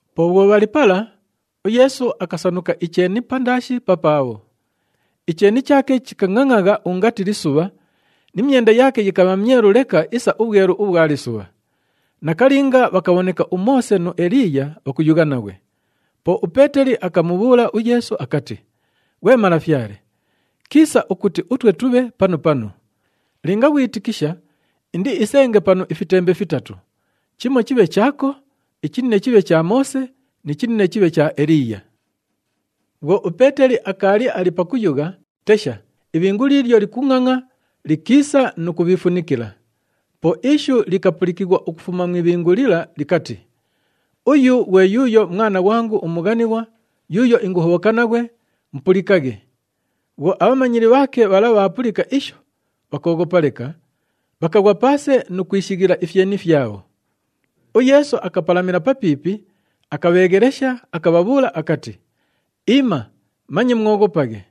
Po bhwo bhali pala, uYeesu akasanuka icheeni pandaashi papaabho. Icheeni chaake chikangʼangʼagha ungati lisubha ni myenda yaake yikabha myelu leka isa ubhwelu ubhwa lisubha. Nakalinga bhakabhoneka uMoose nu Eliiya bhakuyugha naghwe. Po uPeeteli akamubhuula uYeesu akati, “Ghwe Malafyale, kiisa ukuti utwe tubhe panu panu. Linga ghwitikisha, indiisenge panu ifitembe fitatu. Chimo chibhe chaako, ichinine chibhe cha Moose ni chinine chibhe cha Eliiya.” Bhwo uPeeteli akaali ali pakuyugha, tesha, ibhingu liilyo likungʼangʼa likiisa nu kubhiifunikila. Po ishu likapulikighwa ukufuma mu ibhingu lila likati, “Uyu ghwe yuuyo Mwana ghwangu umughanighwa yuuyo inguhobhoka naghwe, mupulikaghe!” Bhwo abhamanyili bhaake bhala bhaapulika isho, bhakooghopa leka, bhakaghwa paase nu kwishighila ifyeni fyabho. UYeesu akapalamila papiipi, akabheeghelesha, akabhabhuula akati, “Iima, manye mwoghopaghe!”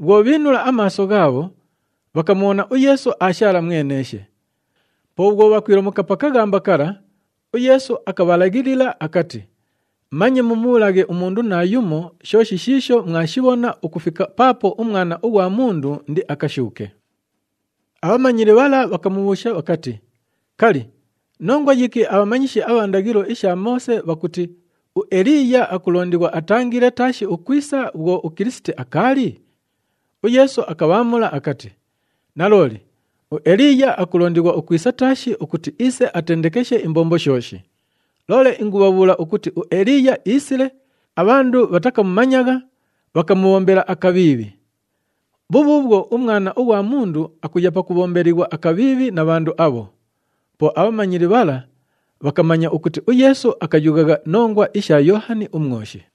Bhwo bhiinula amaaso ghaabho, bhakamubhona uYeesu aashaala mweneeshe. Po bhwo bhakwilomuka pa kaghamba kala, uYeesu akabhalaghilila akati, “Manye mumubhuulaghe umundu naayumo shooshi shiisho mwashibhona ukufika paapo uMwana ughwa Mundu indiakashuuke.” Abhamanyili bhala bhakamubhuusha bhakati, “Kali, nongwa yiki abhamanyishi abha ndaghilo isha Moose bhakuti uEliiya akulondighwa atangile taashi ukwisa bhwo uKilisiti akaali?” UYeesu akabhaamula akati, “Nalooli, uEliiya akulondighwa ukwisa taashi ukuti iise atendekeshe imbombo shooshi. Loole ingubhabhuula ukuti uEliiya iisile, abhandu bhatakamumanyagha, bhakamubhombela akabhiibhi. Bhubhuubhwo, uMwana ughwa Mundu akuya pakubhombelighwa akabhiibhi na bhandu abho.” Po abhamanyili bhala bhakamanya ukuti uYeesu akayughagha nongwa isha Yoohani uMwoshi.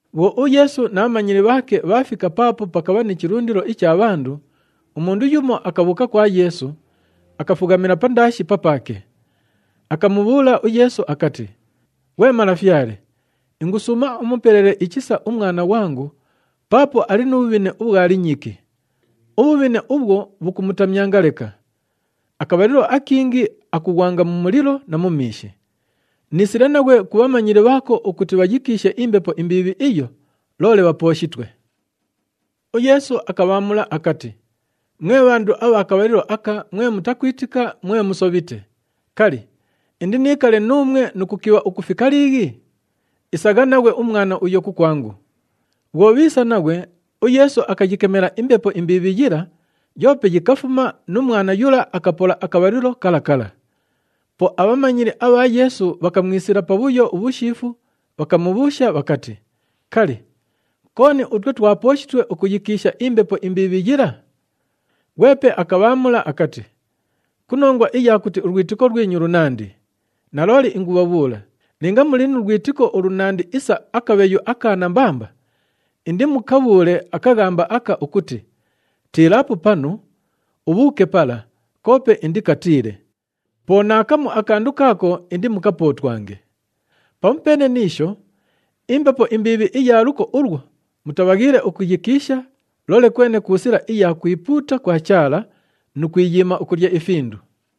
Bhwo uYeesu na bhamanyili bhaake bhaafika paapo pakabha ni chilundilo icha bhandu, umundu yumo akabhuuka kwa Yeesu, akafughamila pandaashi papaake. Akamubhuula uYeesu akati, “Ghwe Malafyale, ingusuuma umupelele ichisa umwana ghwangu paapo ali nu bhubhine ubhwa linyiki. Ubhubhine ubhwo, bhukumutamyanga leka. Akabhalilo akingi akughwanga mu mulilo na mu miishi. Niisile naghwe ku bhamanyili bhaako ukuti bhayikiishe imbepo imbiibhi iyo, loole bhapooshitwe.” UYeesu akabhaamula akati, “Mwe bhandu abha kabhalilo aka mwe mutakwitika, mwe musobhite. Kali, indiniikale nuumwe nu kukibha ukufika liighi? Isagha naghwe umwana uyo kukwangu!” Bhwo bhiisa naghwe, uYeesu akayikemela imbepo imbiibhi yila, yoope yikafuma nu mwana yula akapola akabhalilo kala kala. Po abhamanyili abha Yeesu bhakamwisila pabhuyo ubhushiifu, bhakamubhuusha bhakati, “Kali, kooni utwe twapooshitwe ukuyikiisha imbepo imbiibhi yila?” Ghwepe akabhaamula akati, “Ku nongwa iya kuti ulwitiko lwinyu lunandi. Nalooli ingubhabhuula, linga muli nu lwitiko ulunandi isa akabheyu aka nambamba, indimukabhuule akaghamba aka ukuti, ‘Tiilaapo panu, ubhuuke pala,’ koope indikatiile. Po naakamu akandu kaako indimukapootwange. [ Pamupeene ni isho, imbepo imbiibhi iya luko ulwo mutabhaghiile ukuyikiisha, loole kwene ku sila iya kwipuuta kwa Chaala nu kwiyiima ukulya ifindu.]”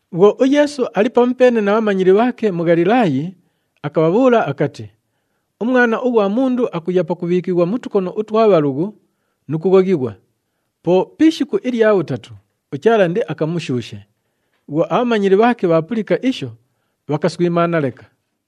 Bhwo uYeesu ali pamupeene na bhamanyili bhaake mu Ghalilaayi, akabhabhuula akati, “UMwana ughwa Mundu akuya pakubhiikighwa mu tukono utwa bhalughu nu kughoghighwa. Po pi ishiku ilya bhutatu, uChaala indiakamushuushe.” Bhwo abhamanyili bhaake bhaapulika isho, bhakaswimaana leka.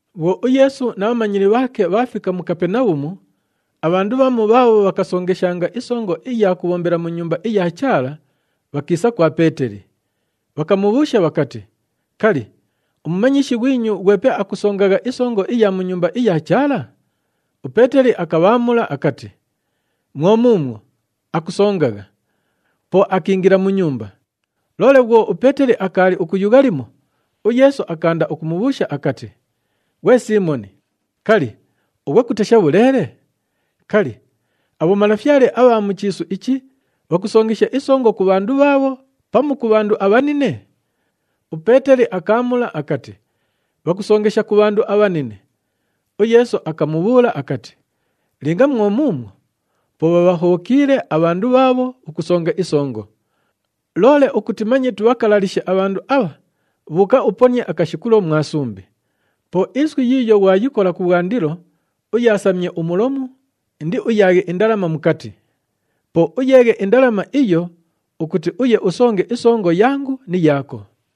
Bhwo uYeesu na bhamanyili bhaake bhaafika mu Kapenabhumu, abhandu bhamu bhaabho bhakasongeshanga isongo iya kubhombela mu Nyumba iya Chaala, bhakiisa kwa Peeteli. Bhakamubhuusha bhakati, “Kali, umumanyishi ghwinyu ghwepe akusongagha isongo iya mu Nyumba iya Chaala?” UPeeteli akabhaamula akati, “Mwo muumwo, akusongagha.” Po akiingila mu nyumba. Loole bhwo uPeeteli akaali ukuyugha limo, uYeesu akaanda ukumubhuusha akati, “Ghwe Siimoni, kali, ughwe kutesha bhuleele? Kali, abhomalafyale abha mu chiisu ichi bhakusongesha isongo ku bhandu bhaabho pamu ku bhandu abhanine?” UPeeteli akaamula akati, “Bhakusongesha ku bhandu abhanine.” UYeesu akamubhuula akati, “Linga mwo muumwo, po bhabhahobhokiile abhandu bhaabho ukusonga isongo. Loole ukuti manye tubhakalalishe abhandu abha, bhuuka uponie akashikulo mwa sumbi. Po iswi yiiyo ghwayikola kubhwandilo, uyaasamye umulomu, indiuyaaghe indalama mukati. Po uyeeghe indalama iyo ukuti uye usonge isongo yangu ni yaako.”